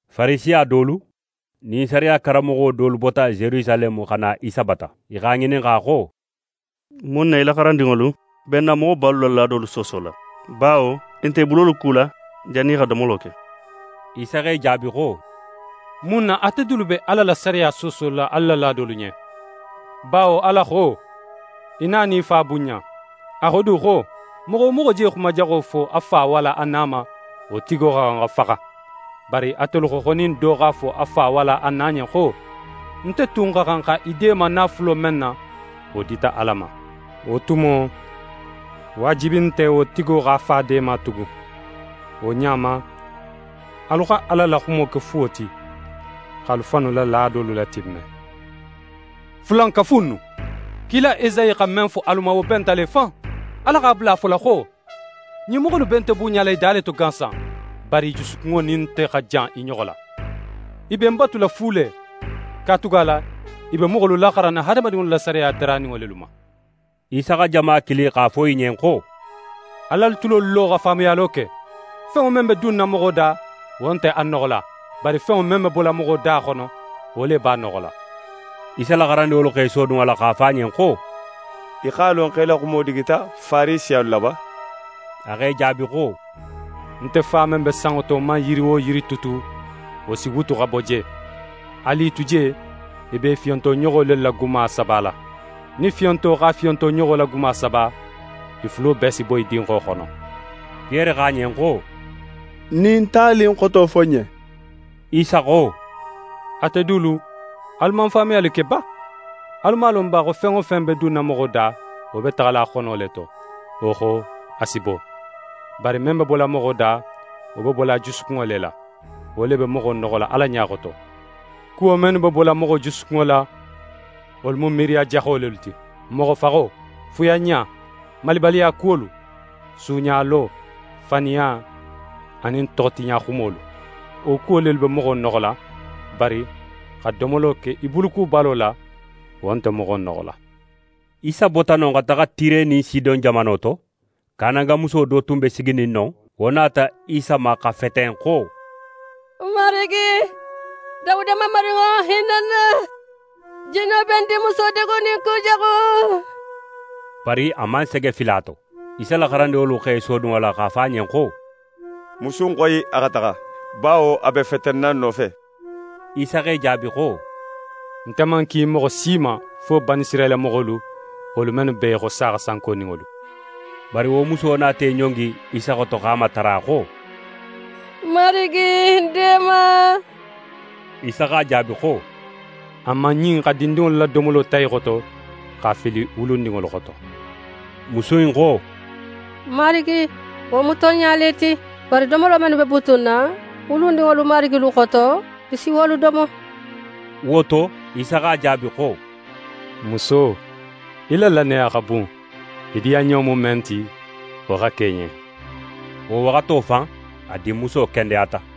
Farisiya dolu nin sariya karanmoxo dolu bota Yerusaleme xa na Isa bata. I x'a ŋininxa xo: «Mun na í la xarandinŋolu be n na moxobalu la laadolu soosola? Bawo, i nte i bulolu kula jannin i xa domolo ke.» Isa x'e jaabi xo: «Mun na ate dulu be Ala la sariya soosola alu la laadolu ɲen? Bawo Ala xo: “Í na nin í fa bunɲa.” A xo du xo: “Moxo wo moxo je xuma jaxo fo a fa walla a na ma, wo tigo xa xan xa faxa.” Bari atelu xo xo nin do x'a fo a fa walla a na ɲen xo: “Nte tun xa xan xa í deema naafulo men na, wo dita Ala ma,” wo tumo, waajibi nte wo tigo x'a fa deema tugun. Wo ɲa ma, alu xa Ala la xumo ke fuwo ti, x'alu fannu la laadolu latimme. Fulankafu innu! Kila Esayi xa men fo alu ma, wo benta le fan. Ala x'a bula a fola xo: “Ɲin moxo innu be nte bunɲala i da le to gansan, bari i jusukunŋo nin nte xa jan i ɲoxo la. I be ń batula fu le; katugala i be moxolu laxaranna hadamadinŋolu la sariya daraninŋo lelu ma.”» Isa xa jama kili x'a fo i ɲen xo: «Al'alu tulolu lo xa faamuyalo ke. Fenŋo men be dunna moxo da, wo nte a noxola, bari fenŋo men be bola moxo da xono, wo le b'a noxola.» Isa la xarandinŋolu x'e sodun a la x'a fo a ɲen xo: «Í x'a lon xo í la xumo digita Farisiyalu la ba?» A x'e jaabi xo: «Nte Fa men be sanŋo to man yiri wo yiri tutu, wo si wutu xa bo je. Alu i tu je, i be i fiyonto ɲoxo lelu la guma sabala. Nin fiyonto x'a fiyonto ɲoxo la guma saba, i fulo bee si boyi dinxo xono.» Piyere xo a ɲen xo: «Ɲin tali in xoto fo ń ɲen». Isa xo: «Ate dulu, alu man faamuyali ke ba? Alu man a lon ba xo fen wo fen be dunna moxo da, wo be taxala a xono le to, wo xo a si bo? Bari men be bola moxo da, wo be bola a jusukunŋo le la, wo le be moxo noxola Ala ɲa xoto. Kuwo mennu be bola moxo jusukunŋo la, wolu mu miiriya jaxo lelu ti: Moxofaxo, fuyanɲa, malibaliya kuwolu, suuɲalo, faniya anin toxotiɲaxumolu. Wo kuwo lelu be moxo noxola, bari xa domolo ke í bulukubalo la, wo nte moxo noxola.» Isa bota non xa taxa Tire nin Sidon jamano to. Kanangamuso do tun be siginin non, wo nata Isa ma xa feten xo: «Marigi, Dawuda Mamarinŋo, hinna ń na! Jinno be ń dinmuso degunin kujaxu.» Bari a man sege fili a to. Isa la xarandinŋolu x'e sodun a la x'a fo a ɲen xo: «Musu in xoyi a xa taxa; bawo a be fetenna n nofe.» Isa x'e jaabi xo: «Nte man ki moxo si ma fo Banisirayila moxolu, wolu mennu be í xo saaxa sankoninŋolu.» Bari wo muso nata í ɲongi Isa xoto x'a matara xo: «Marigi, ń deema!» Isa x'a jaabi xo: «A man ɲin xa dindinŋolu la domolo ta i xoto, x'a fili wulundinŋolu xoto.» Musu in xo: «Marigi, wo mu tonɲa le ti. Bari domolo mennu be butunna wulundinŋolu marigilu xoto, i si wolu domo.» Wo to, Isa x'a jaabi xo: «Muso, í la lannaya xa bun, í diyanɲo mu men ti, wo xa ke í ɲen.» Wo waxato fan, a dinmuso kendeyata.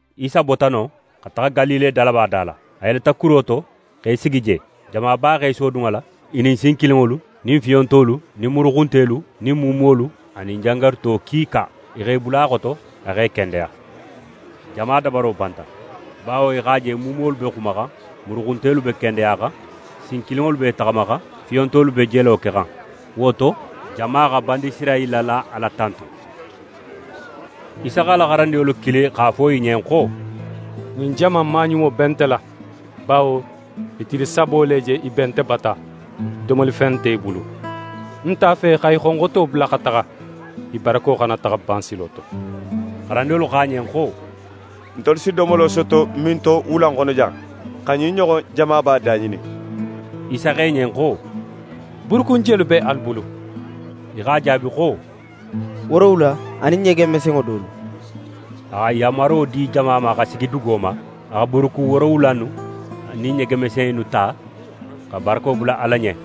Isa bota non xa taxa Galile dalaba da la. A yeleta kuro to x'é sigi je. Jamaba x'é sodun a la, i nin sinkilinŋolu nin fiyontolu nin muruxuntelu nin muumuwolu anin jangaruto kiika. I x'e bula a xoto, a x'e kendeya. Jama dabaro banta, bawo i x'a je muumuwolu be xumaxan, muruxuntelu be kendeyaxan, sinkilinŋolu b'e taxamaxan, fiyontolu be jelo kexan. Wo to, jama xa Banisirayila la Ala tantu. Isa x'a la xarandinŋolu kili x'a fo i ɲen xo: «Ɲin jama in maɲumo be nte la; bawo i tili sabo le je i be nte bata, domolifen dun nte i bulu. Ń nte a fe xa i xonxoto bula xa taxa, i barako xana taxa ban silo to.» Xarandinŋolu xo a ɲen xo: «Ntelu si domolo soto minto wula in xono jan, xa ɲin ɲoxon jamaba daŋinin?» Isa xo i ɲen xo: «Buurukun jelu be alu bulu?» I x'a jaabi xo: «Woorowula anin ɲege mesenŋo dolu.» A xa yanmaro di jama ma xa sigi dugo ma. A xa buurukun woorowula innu anin ɲege mese innu ta, xa barako bula Ala ɲen,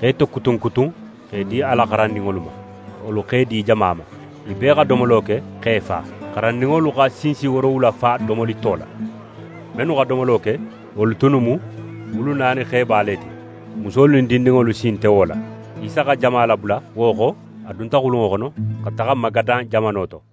x'e tokutun kutun x'e di a la xarandinŋolu ma. Wolu x'e di jama ma. I bee xa domolo ke, x'e fa. Xarandinŋolu xa sinsi woorowula fa domoli to la. Mennu xa domolo ke, wo tunnu mu wulu naani xeba le ti, musolu nin dindinŋolu sin nte wo la. Isa xa jama labula, wo xo, a dunta xulunŋo xono, xa taxa Magadan jamano to.